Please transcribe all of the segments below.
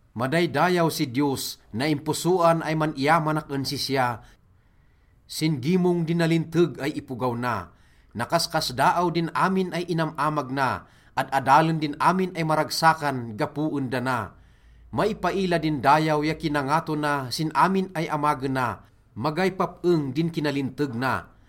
Madaydayaw si Diyos! Naimposoan ay man-iyamanak en sisya sin gimong di nalinteg ay ipogaw na. Nakaskasdaaw din amin ay inam-amag na, ad-adalen din amin ay maragsakan gapo en dana. Maipaila din dayaw ya kinangato na sin amin ay amagena, magay pap-eng din kinalinteg na.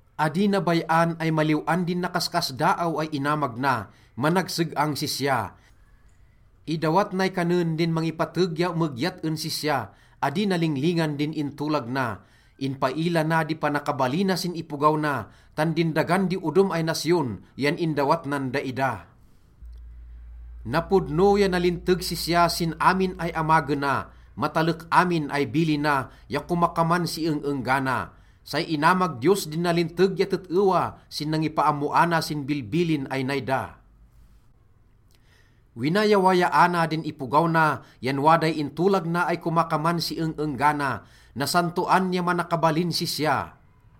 Adi na bay-an ay maliw-an din nakaskasdaaw ay inamag na, managseg-ang sisya. Idawat nay kanen din mangipateg ya emegyat en sisya, adi na linglingan din intolag na. Inpaila na di panakabalina sin ipogaw na, tan din dagan di odom ay nasyon yan indawat nan daida. Napodno ya nalinteg sisya sin amin ay amagena, matalek amin ay bilina ya komakaman si eng-enggana. Say inamag Diyos din nalinteg ya tet-ewa sin nangipaammoana sin bilbilin ay nay da. Winayawayaana din ipogaw na yan waday intolag na ay komakaman si eng-enggana. Nasantoan ya manakabalin sisya.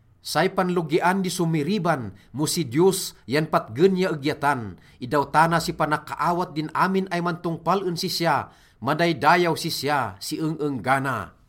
Say panlogian di somiriban mo si Diyos yan patgen ya egyatan. Indawtana si panakaawat din amin ay mantongpal en sisya, madaydayaw sisya si eng-enggana.